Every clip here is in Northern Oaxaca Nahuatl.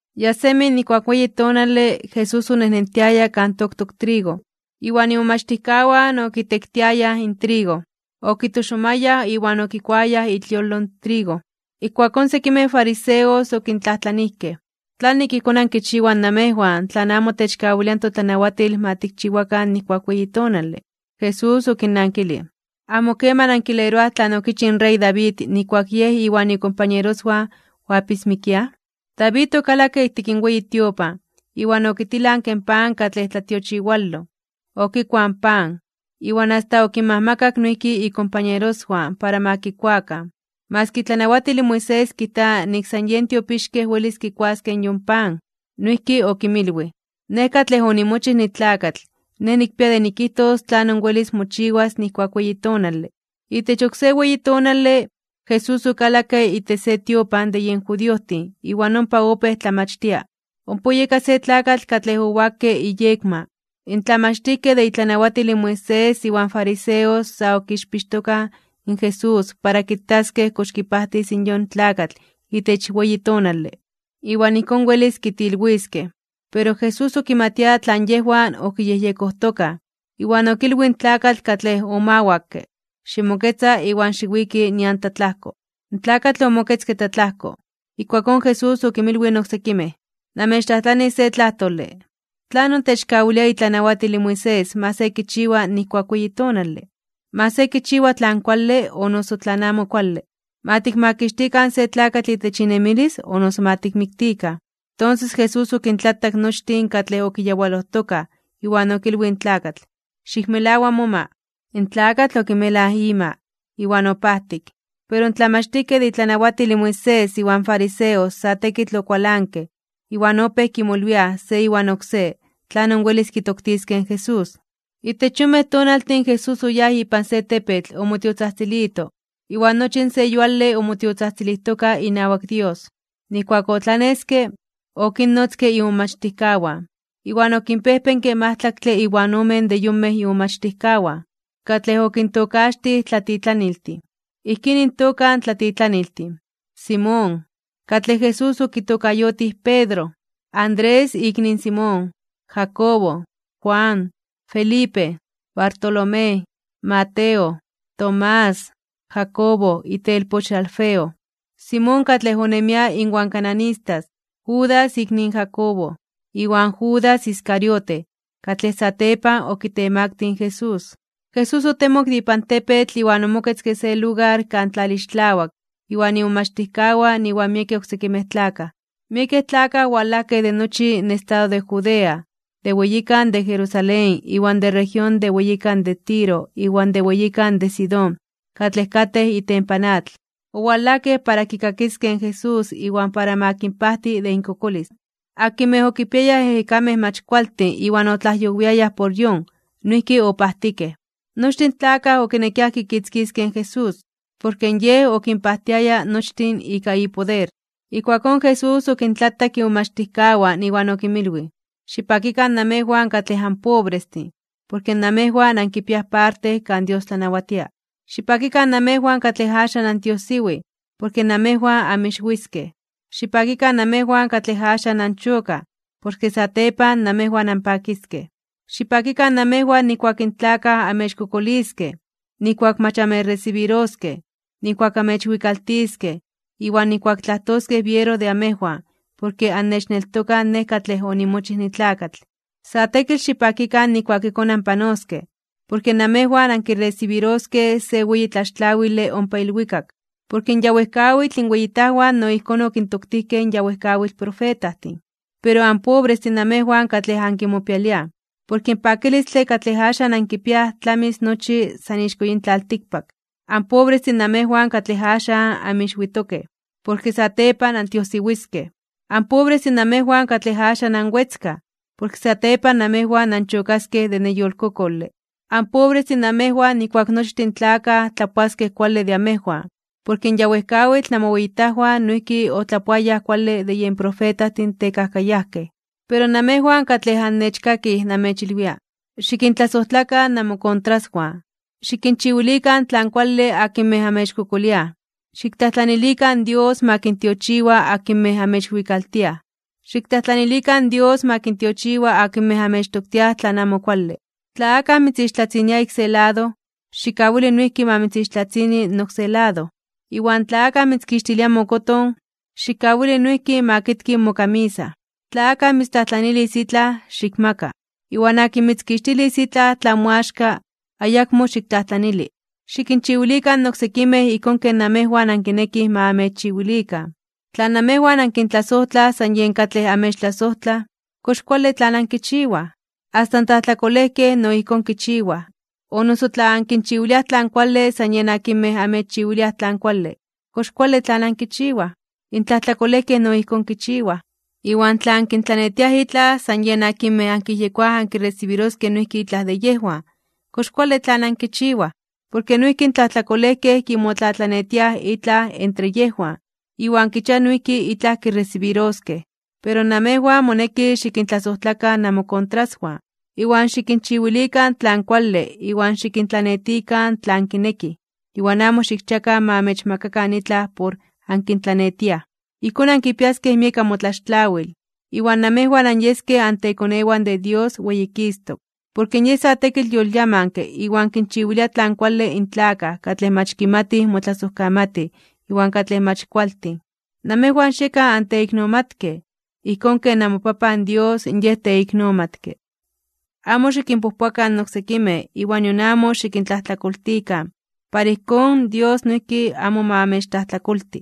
Ya semi nijkuak weyi tonale, Jesús onejnentiaya kan toktok trigo, iwan imomachtijkawan okitektiayaj in trigo. Okitoxomayaj iwan okikuayaj itliolo in trigo. Ijkuakón sekimej fariseos okintlajtlanijkej: ―¿Tlanik ijkón ankichiwaj namejwan tlan amo techkawilia in totlanawatil ma tikchiwakan nijkuak weyi tonale? Jesús okinnankilij: ―¿Amo keman ankileroaj tlan okichij in rey David nijkuak yej iwan ikompañeroswan oapismikiaj? David okalakke ijtik in weyi tiopan, iwan okitilanke in pan katlej tlatiochiwaloj, okikuaj in pan, iwan asta okinmajmakak noijki ikompañeroswan para ma kikuakan. Maski itlanawatil in Moisés kijta nik san yen tiopixkej welis kikuaskej yon pan. Noijki okinmilwij: ―Nej katlej onimochij nitlakatl, Nej nikpia de nikijtos tlanon welis mochiwas nijkuak weyi tonale. Itech oksé weyi tonale, Jesús okalakke itech se tiopan de yen judiojtin iwan ompa opéj tlamachtia. Ompa oyeka se tlakatl katlej owakke iyekma. In tlamachtijkej de itlanawatil in Moisés iwan fariseos sa okixpixtokaj in Jesús para kitaskej kox kipajtis in yon tlakatl itech weyi tonale, iwan ijkón welis kitilwiskej. Pero Jesús okimatia tlan yejwan okiyejyekojtokaj, iwan okilwij in tlakatl katlej omawakke: ―Ximoketza iwan xiwiki nian tlatlajko. In tlakatl omoketzke tlatlajko. Ijkuakón Jesús okinmilwij in oksekimej: ―Namechtlajtlanis se tlajtole: ¿Tlanon techkawilia itlanawatil in Moisés ma se kichiwa nijkuak weyi tonale? ¿Ma se kichiwa tlan kuale o noso tlan amo kuale? ¿Ma tikmakixtikan se tlakatl itech inemilis, o noso ma tikmiktikan? Tonses Jesús okintlatak nochtin katlej okiyawalojtokaj, iwan okilwij in tlakatl: ―Xikmelawa moma. In tlakatl okimelaj ima, iwan opajtik. Pero in tlamachtijkej de itlanawatil in Moisés iwan fariseos sa tekitl okualankej, iwan opéj kimolwiaj se iwan oksé tlanon welis kitoktiskej in Jesús. Itech yonmej tonaltin Jesús oyáj ipan se tepetl omotiotzajtzilito, iwan nochi in se yuale omotiotzajtzilijtoka inawak Dios. Nijkuak otlaneske, okinnotzke imomachtijkawan, iwan okinpejpenke majtlaktle iwan ome de yonmej imomachtijkawan, katlej okintokaxtij tlatitlaniltin. Ijkín intoka in tlatitlaniltin: Simón, katlej Jesús okitokayotij Pedro, Andrés ikni in Simón, Jacobo, Juan, Felipe, Bartolomé, Mateo, Tomás, Jacobo itelpoch in Alfeo, Simón katlej onemia inwan cananistas, Judas ikni in Jacobo, iwan Judas Iscariote, katlej satepan okitemaktij (okitemaktilij) in Jesús. Jesús otemok de ipan tepetl iwan omoketzke se lugar kan tlalixtlawak iwan imomachtijkawan iwan miekej oksekimej tlakaj. Miekej tlakaj owalajkej de nochi in estado de Judea, de weyikan de Jerusalén iwan de región de weyikan de Tiro iwan de weyikan de Sidón katlej katej itempan atl. Owalajkej para kikakiskej in Jesús iwan para ma kinpajti de inkokolis. Akinmej okipiayaj ejekamej mach kualtin iwan otlajyowiayaj por yon, noijki opajtikej. Nochtin in tlakaj okinekiaj kikitzkiskej in Jesús, porke Yej okinpajtiaya nochtin ika ipoder. Ijkuakón Jesús okintlatak imomachtijkawan iwan okinmilwij: ―Xipakikan namejwan katlej anpobrestin, porke namejwan ankipiaj parte kan Dios tlanawatia. ’Xipakikan namejwan katlej axan antiojsiwij, porke namejwan anmixwiskej. ’Xipakikan namejwan katlej axan anchokaj, porke satepan namejwan anpakiskej. ’Xipakikan namejwan nijkuak in tlakaj amechkokoliskej, nijkuak mach amechresibiroskej, nijkuak amechwikaltiskej, iwan nijkuak tlajtoskej biero de amejwan porke annechneltokaj Nej katlej onimochij nitlakatl. Sa tekitl xipakikan nijkuak ijkón anpanoskej, porke namejwan ankiresibiroskej se weyi tlaxtlawile ompa ilwikak. Porke in ya wejkawitl inweyitajwan no ijkón okintoktijkej in ya wejkawitl profetajtin. ’Pero anpobrestin namejwan katlej ankimopialiaj, porke in pakilistle katlej axan ankipiaj tlamis nochi san ixko yin tlaltikpak. ’Anpobrestin namejwan katlej axan anmixwitokej, porke satepan antiojsiwiskej. ’Anpobrestin namejwan katlej axan anwetzkaj, porke satepan namejwan anchokaskej de neyolkokole. ’Anpobrestin namejwan nijkuak nochtin in tlakaj tlapoaskej kuale de amejwan, porke in ya wejkawitl namoweyitajwan noijki otlapoayaj kuale de yen profetajtin tekajkayajkej. ’Pero namejwan katlej annechkakij namechilwia: Xikintlasojtlakan namokontraswan. Xikinchiwilikan tlan kuale akinmej amechkokoliaj. Xiktlajtlanilikan in Dios ma kintiochiwa akinmej amechwikaltiaj. Xiktlajtlanilikan in Dios ma kintiochiwa akinmej amechtoktiaj tlan amo kuale. Tla akaj mitzixtlatzinia ik se lado, xikkawili noijki ma mitzixtlatzini in oksé lado. Iwan tla akaj mitzkixtilia mokoton, xikkawili noijki ma kitki mokamisa. Tla akaj mitztlajtlanilis itlaj, xikmaka. Iwan akin mitzkixtilis itlaj tlan moaxka, ayakmo xiktlajtlanili. Xikinchiwilikan in oksekimej ijkón ken namejwan ankinekij ma amechchiwilikan. ’Tla namejwan ankintlasojtlaj san yen katlej amechtlasojtlaj, ¿kox kuale tlan ankichiwaj? Asta in tlajtlakolejkej no ijkón kichiwaj. O noso tla ankinchiwiliaj tlan kuale san yen akinmej amechchiwiliaj tlan kuale, ¿kox kuale tlan ankichiwaj? In tlajtlakolejkej no ijkón kichiwaj. Iwan tla ankintlanetiaj itlaj san yen akinmej ankiyejyekoaj ankiresibiroskej noijki itlaj de yejwan, ¿kox kuale tlan ankichiwaj? Porke noijki in tlajtlakolejkej kimotlatlanetiaj itlaj entre yejwan, iwan kichiaj noijki itlaj kiresibiroskej. Pero namejwan moneki xikintlasojtlakan namokontraswan, iwan xikinchiwilikan tlan kuale iwan xikintlanetikan tlan kinekij iwan amo xikchiakan ma amechmakakan itlaj por ankintlanetiaj. Ijkón ankipiaskej miek amotlaxtlawil, iwan namejwan anyeskej antekonewan de Dios weyikistok (weyititok). Porke Yej sa tekitl yolyamanke iwan kinchiwilia tlan kuale in tlakaj katlej mach kimatij motlasojkamatij iwan katlej mach kualtin. Namejwan xiekan anteiknomatkej, ijkón ken namoPapan Dios Yej teiknomatke. ’Amo xikinpojpoakan in oksekimej iwan nion amo xikintlajtlakoltikan para ijkón Dios noijki amo ma amechtlajtlakolti.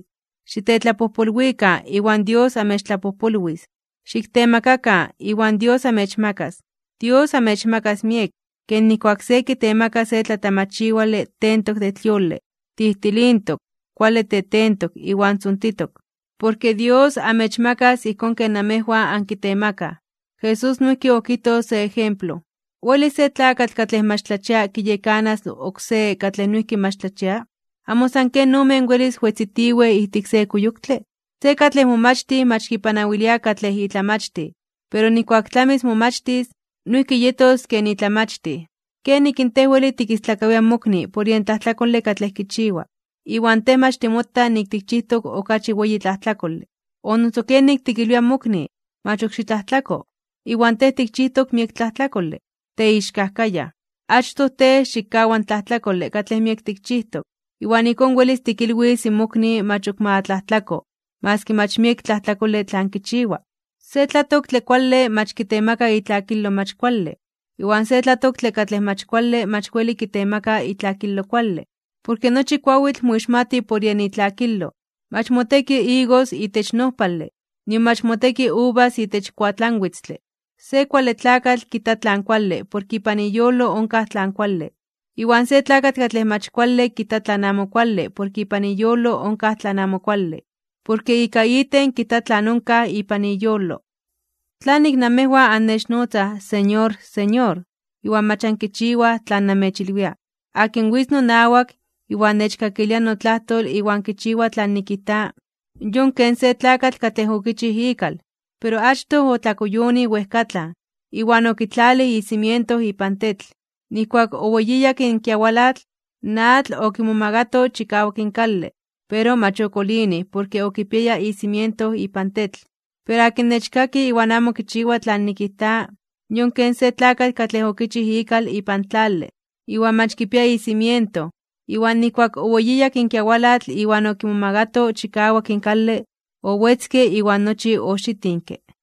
Xitetlapojpolwikan, iwan Dios amechtlapojpolwis. Xiktemakakan, iwan Dios amechmakas. Dios amechmakas miek, ken ijkuak se kitemaka se tlatamachiwale tentok de tliole, tijtilintok, kuale tetentok iwan tzontitok, porke Dios amechmakas ijkón ken namejwan ankitemakaj. Jesús noijki okijtoj se ejemplo: ―¿Welis se tlakatl katlej mach tlachia kiyekanas oksé katlej noijki mach tlachia? ¿Amo san ken omen welis wetzitiwej ijtik se kuyoktle? Se katlej momachtij mach kipanawilia katlej itlamachtij. Pero nijkuak tlamis momachtis, noijki yetos ken itlamachtij. ’¿Kenik in tej weli tikistlakawia in mokni por yen tlajtlakole katlej kichiwa, iwan tej mach timota nik tikchijtok okachi weyi tlajtlakole? ¿O noso kenik weli tikilwia in mokni: “Mach ok xitlajtlako”, iwan tej tikchijtok miek tlajtlakole? ¡Teixkajkayaj! Achtoj tej xikkawa in tlajtlakole katlej miek tikchijtok, iwan ijkón welis tikilwis in mokni mach ok ma tlajtlako maski mach miek tlajtlakole tlan kichiwa. ’Se tlatoktle kuale mach kitemaka itlakilo mach kuale, iwan se tlatoktle katlej mach kuale mach weli kitemaka itlakilo kuale. Porke nochi kuawitl moixmati por yen itlakilo. Mach moteki igos itech nojpale, nion mach moteki uvas itech kuatlanwitztle. Se kuale tlakatl kijta tlan kuale porke ipan iyolo onkaj tlan kuale, iwan se tlakatl katlej mach kuale kijta tlan amo kuale porke ipan iyolo onkaj tlan amo kuale. Porke ika iten kijta tlan onkaj ipan iyolo. ’¿Tlanik namejwan annechnotzaj, “Señor, Señor”, iwan mach ankichiwaj tlan namechilwia? Akin witz nonawak, iwan nechkakilia notlajtol iwan kichiwa tlan nikijta, yon ken se tlakatl katlej okichij ikal, pero achtoj otlakuyonij wejkatlan, iwan okitlalij in cimiento ipan tetl. Nijkuak oweyiyak in kiawalatl, in atl okimomagato chikawak in kale, pero mach okolinij porke okipiaya icimiento ipan tetl. Pero akin nechkaki iwan amo kichiwa tlan nikijta, yon ken se tlakatl katlej okichij ikal ipan tlale, iwan mach kipia icimiento. Iwan nijkuak oweyiyak in kiawalatl iwan okimomagato chikawak in kale, owetzke iwan nochi oxitinke.